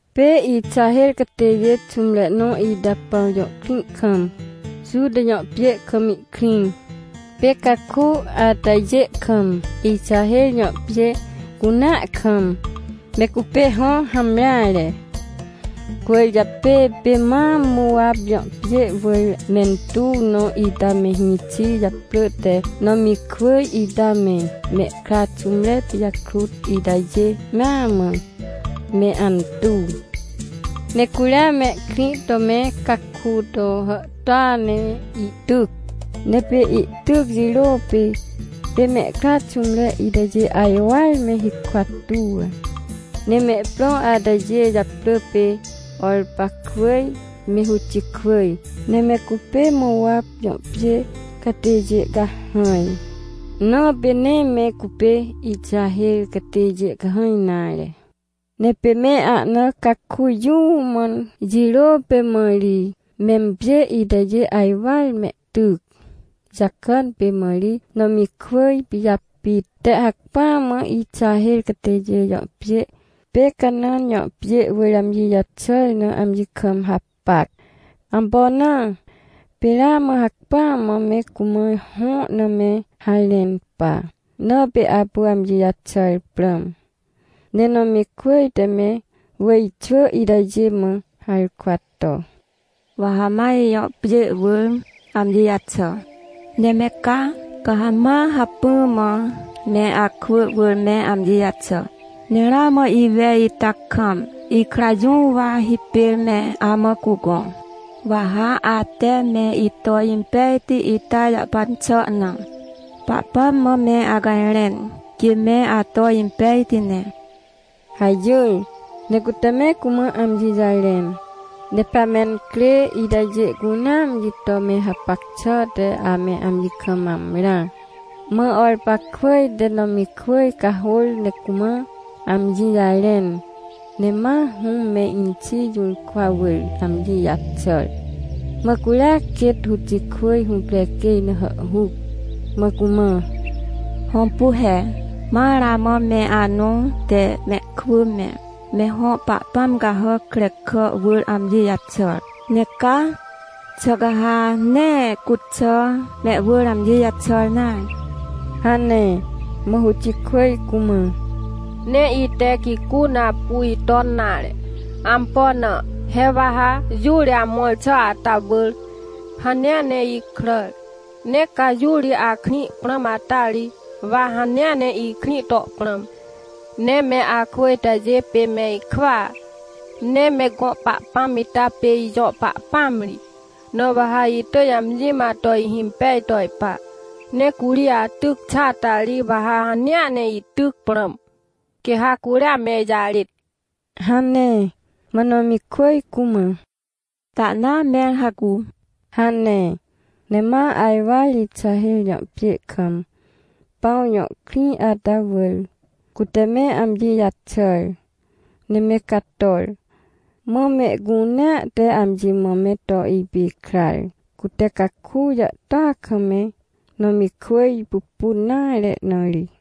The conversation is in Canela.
Pê Ixaher catêjê xũmre nõ ita Pãw jõ krĩ kam, Juta jõ pjê kam ihkrĩ. Pê caku atajê kam, Ixaher jõ pjê cunea kam, me cupê hõ hamreare. Cwỳrjapê pê ma Mowap jõ pjê wỳr mentuw nõ ita me hĩxi japrỳ te Nomikwỳj ita me, mehkra xũmre pijakrut itajê mea mã, me antuw. Ne curia mehkrĩ to me caku to hàhtôa ne ihtyc. Ne pê ihtyc jirô pê, pê mehkra xũmre itajê ajwar me hikwa tuw. Ne mehprõ atajê japrỳ pê Orpakwỳj me Rutikwỳj, ne me cupê Mowap jõ pjê catêjê cahãj, na pê nee me cupê Ixaher catêjê cahãj nare. Ne pê me ahna caku jũũ mãn jirô pê mã ri, mempjê itajê ajwar mehtyc. Jakàn pê mã ri Nomikwỳj pijapit te hacpỹa mã Ixaher catêjê jõ pjê pê Canãn jõ pjê wỳr amji jaxàr na amji kam hapac. Ampo na? Pê ramã hacpỹa mã me cumã hõ na me harẽn pa, na pê apu amji jaxàr prãm. Ne Nomikwỳj te me wỳjxwỳ itajê mã harkwa to: — Wa ha ma ijõ pjê wỳr amji jaxà, ne me ca, ca ha ma hacpỹa mã me akwỳ wỳr me amji jaxà. Ne ramã iwej ita kam, ikra jũ wa hipêr me amã cugõ? Wa ha ate me ito impejti ita jahpan xà na, Pahpãm mã me acajrẽn, quê me ato impejti ne — hajỹr. Ne cute me cumã amji jarẽn. Ne pea mencrê itajê cunea amji to me hapac xà te ame amji kam amrã. Mã Orpakwỳj te Nomikwỳj cahôr ne cumã amji jarẽn, ne ma hũm me inxi jũrkwa wỳr amji jaxàr. Mã curia quêt Rutikwỳj hũprequêj na hàhhuc, mã cumã: — Hõmpu he, ma ramã me anõ te mehkwỳ me, me hõ pahpãm cahàc krekà wỳr amji jaxàr. Ne ca, xà ca ha nee cuxà mehwỳr amji jaxàr nare? — hane. Mã Rutikwỳj cumã: — Nee ite gicu na apu iton nare. Ampo na? He wa ha jũ ri amõr xà ata wỳr, hanea ne ikràr. Ne ca jũ ri akrĩ prãm ata ri, wa hanea ne ikrĩ to prãm. Ne me akwỳ itajê pê me ikwỳa, ne me gõ Pahpãm ita pê ijõ Pahpãam ri, na wa ha itỳj amji mã to ihimpej to ipa. Ne curi atyc xàa ta ri, wa ha hanea ne ityc prãm, quê ha curia me ijarêt — hane. Mã Nomikwỳj cumã: — Tahnaa, mẽr hacu — hane. Ne ma ajwar Ixaher jõ pjê kam, Pãw jõ krĩ ata wỳr, cute me amji jaxàr, ne me cator. Mã mehcunea te amji mã me to ipikrar, cute caku jàhtôa kam me Nomikwỳj pupun nare na ri.